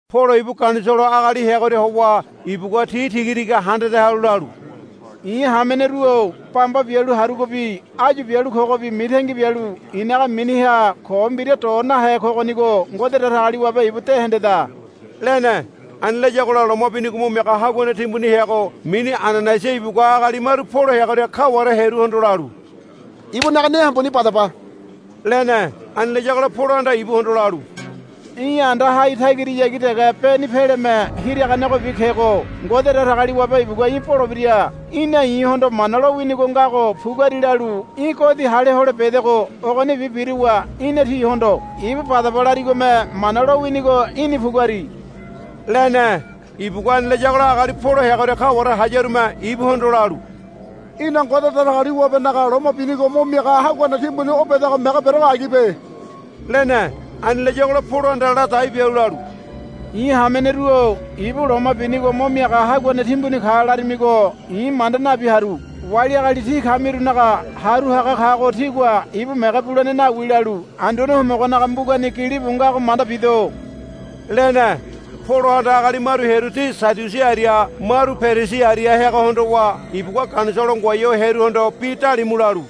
Polo ibu Ganisolo agali heagoria howa ibugua ti tigatiga handade halu lalu, I̱ hameneru-o. Bamba bialu harugobi áyu bialu kogobi mitangi bialu i̱naga miniha ko mbira do nahe kogonigo Ngode Datagaliwabe ibu de hendeda, lene. Ani layagola loma binigo mo miaga haguane timbuni heago mini Ananaiasa ibugua agali maru Polo heagoria kaware hearuhondo lalu, Ibunaga ne hambuni badaba, lene. Ani layagola Polohanda ibuhondo lalu, Í̠ anda hai tagirahayagi dege beni peleme hiraganegobi kego. Ngode Datagaliwabe ibugua í̠ bolebira. Í̠na i̱hondo Mana lowinigo ngago puguari lalu í̠ godi hale hole bedego. Ogonibi biruwa í̠na tihondo, Ibu badaba, larigome Mana lowinigo í̠ni puguari, lene. Ibugua ani layagola agali Polo heagoria kaware hayarume ibuhondo lalu, Í̠na Ngode Datagaliwabenaga loma binigo mo miaga haguane timbuni o bedago mege berego agibe, lene. Ani layagola Polohanda ladai bialu lalu, I̱ hameneru-o ibu loma binigo mo miaga haguane timbuni ka laramigo i̱ manda nabi haru. Wali agali tí kamirunaga haru haga kago tígua ibu mege bulene nawi, lalu Anduane Homogonaga mbugani gilibu ngago manda bido, lene. Polohanda agali maru hearu ti Sadiusi aria maru Perisi aria heago hondowa ibugua Ganisolo ngoai ho hearuhondo bi dalimu lalu,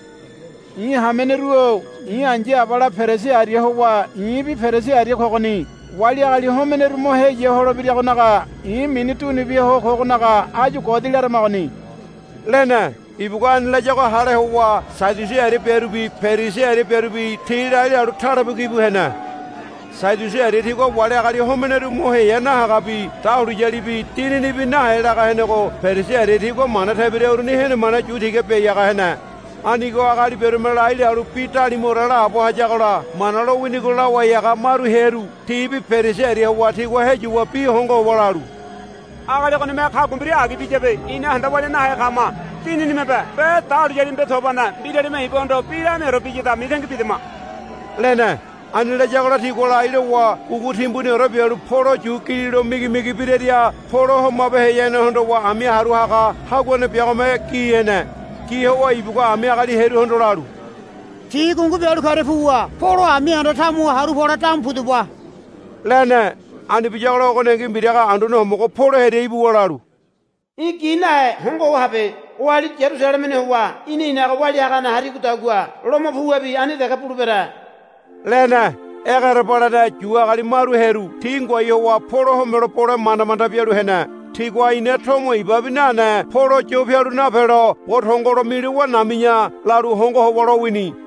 I̱ hameneru-o i̱ ai̱ya abala Perisi aria howa i̱bi Perisi aria kogoni. Wali agali homeneru mo heya holebiragonaga i̱ mini dunu bia ho kogonaga áyu godi laramagoni, lene. Ibugua ani layago hale howa Sadiusi aria biarubi Perisi aria biarubi ti lai lalu talebuki bu hene. Sadiusi aria tigua wali agali homeneru mo heya nahagabi dahuliyalibi dininibi nahe laga henego Perisi aria tigua mana tebira uruni henemane yu tiga biai haga hene. Anigo agali biarume lai lalu bi dalimuore laabo hayagola Mana lowinigo lawai haga maru hearu tibi Perisi aria howa tigua heyuwa bi hongo howa lalu, Agali ogonime kagua mbira agi biyabe ina handa walia nahe kama. Dininimebe be dahuliyalimebe tobane mbiralime ibuhondo bi lamiaore biyada mitangi bidama, lene. Ani layagola tigua lai lowa gungu timbuniore bialu Polo yu gililo migimigi biraria Polo homabeheyane hondowa ami haru haga haguane biagome gi hene. Gi howa ibugua ami agali hearuhondo lalu, Ti gungu bialu karia puwa Polo ami anda tamuha haru pole damu pudaba, lene. Ani biyagola ogoningi mbiraga Anduane Homogo Polo hearia ibuwa lalu, Í̠ gi nahe hongo ho habe. Oali Yarusalemeni howa ína i̱naga walia hagane harigodagua Lomo puwabi ani dege bulebere, lene. Egerebalene Yu agali maru hearu ti ngoai howa Polo homelo bole manda manda bialu hene. Tigua, Ina tomo ibabi nane Polo yo pialu napelo bo tongolo milowa nami̱ya, lalu hongo howa lowini.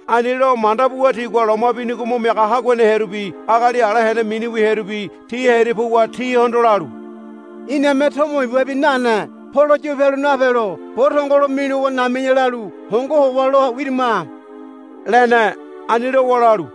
Ani lo manda buwa tigua loma binigo mo miaga haguane hearubi agali ala hene miniwi hearubi ti hearia puwa tihondo lalu, Iname tomo ibabi nane Polo yo pialu napelo bo tongolo milowa nami̱ya lalu hongo howa lo wirima, lene. Ani lowa lalu,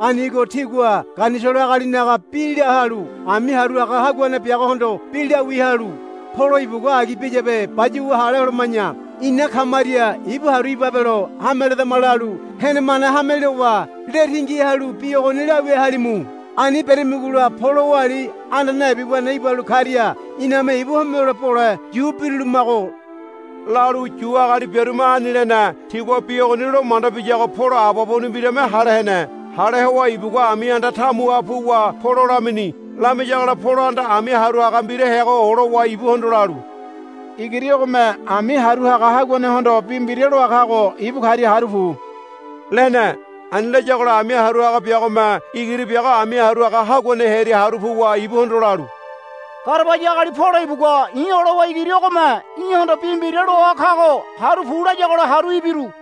Anigo tígua Ganisolo agalinaga bi la halu ami haru haga haguane biagohondo bi lawia halu, Polo ibugua agi biyabe bayuwa hale holoma̱ya ina kamaria ibu haru ibabelo hame ledama, lalu henemane hame lowa le tingi halu bi ogoni lawia halimu. Ani beramigola Polo oali anda naibi wene ibalu karia iname ibu homelo bole yu birulumago, lalu Yu agali biarume ani lene. Tigua bi ogoni lo manda biyago Polo ababuni mbirame hale hene. Hale howa ibugua ami anda tamuha puwa Polo lamini. Lamiyagola Polohanda ami haru haga mbira heago olowa ibuhondo lalu, Igiri ogome ami haru haga haguanehondo bi mbira loa kago ibu karia haru pu, lene. Ani layagola ami haru haga biagome igiri biago ami haru haga haguane hearia haru puwa ibuhondo lalu, Garabaya agali Polo ibugua i̱ olowa igiri ogome í̠hondo bi mbira loa kago haru pu layagola haru ibiru,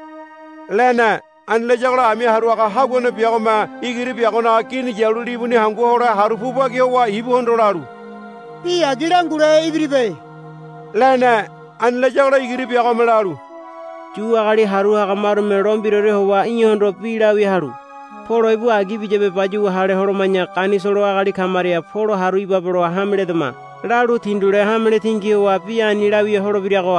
lene. Ani layagola ami haru haga haguane biagome igiri biagonaga gini yalu libuni hangu hole haru pu bagi howa ibuhondo lalu, Bi agi langule ibiribe, lene. Ani layagola igiri biagome lalu, Yu agali haru haga marume lo mbiraore howa í̠hondo bi lawia halu, Polo ibu agi biyabe bayuwa hale holoma̱ya Ganisolo agali kamaria Polo haru ibabelo hame ledama, lalu tindule hamele tingi howa bi ani lawia holebirago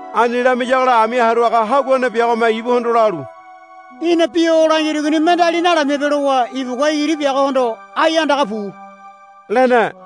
Ani lamiyagola ami haru haga haguane biagome ibuhondo lalu, Í̠na bi o langirigoni mendeali nalamibe, lowa ibugua igiri biagohondo, Ai andaga pu, lene.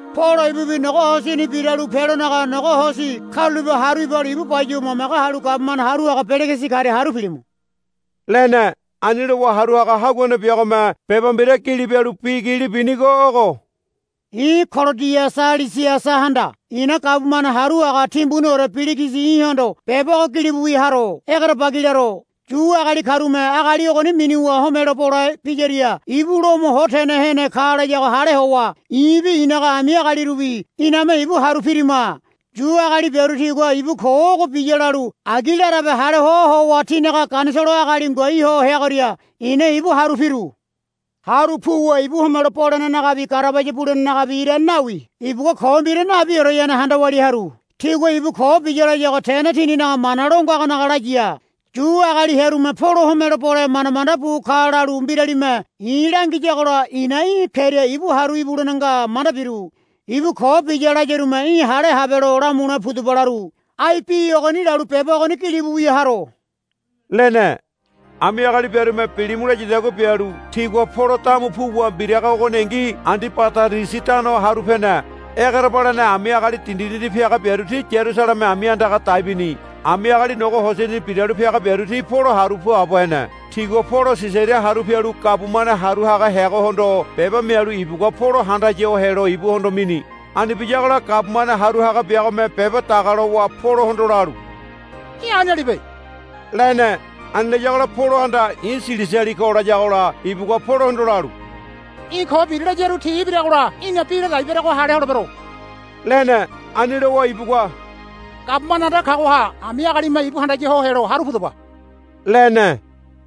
Polo ibubi nogo hosini biralu pelonaga nogo hosi karulape haru ibalu ibu bayuwa mamage halu gabumane haru haga Peligisi karia haru pilimu, lene. Ani lowa haru haga haguane biagome beba mbira gili bialu bi gili binigo ogo, I̱ Kolodiasa Lisiasahanda i̱na gabumane haru haga timbuniore Peligisi í̠hondo beba ogo gilibu wia haro. Egerebagi laro. Yu agali karume agali ogoni minuwa homelo bole biyaria ibu Lomo ho tene hene ka layago hale howa i̱bi i̱naga ami agalirubi iname ibu haru pirima. Yu agali biaru tigua ibu ko ogo biya lalu agi larabe hale hoa howa tinaga Ganisolo agali ngoai ho heagoria i̱na ibu haru piru. Haru puwa ibu homelo bolenenagabi garabaya bulenenagabi irane nawi ibugua ko mbira nabioreyane handa walia haru. Tigua ibu ko biya layago tene tininaga mana lo ngagonaga laya. Yu agali hearume Polo homelo bole manda manda bu ka lalu mbiralime i̱ langiyagola i̱na í̠ keria ibu haru ibulene nga manda biru. Ibu ko biya layarume í̠ hale habelo lamule pudaba laru. Ai bi ogoni lalu beba ogoni gilibu wia haro, lene. Ami agali biarume bilimu layadagua bialu tigua Polo damu puwa mbiraga ogoningi Andibadarisi tano haru pene. Egerebalene ami agali dindidindi piaga biaru ti Yarusaleme ami andaga dai bini. Ami agali nogo hosini biralu piaga biaru ti Polo haru puabo hene. Tigua Polo Sisaria haru pialu gabumane haru haga heagohondo beba mialu ibugua Polo handaya ho helo ibuhondo mini. Ani biyagola gabumane haru haga biagome beba daga lowa Polohondo lalu, Í̠ anialibe, lene. Ani layagola Polohanda, I̱ Silisiali ko, layagola ibugua Polohondo lalu, Í̠ ko biri layaru ti ibiragola í̠na bi ladai berego hale holebero, lene. Ani lowa ibugua, Gabumane anda kagoha ami agalime ibu handaya ho helo haru pudaba, lene.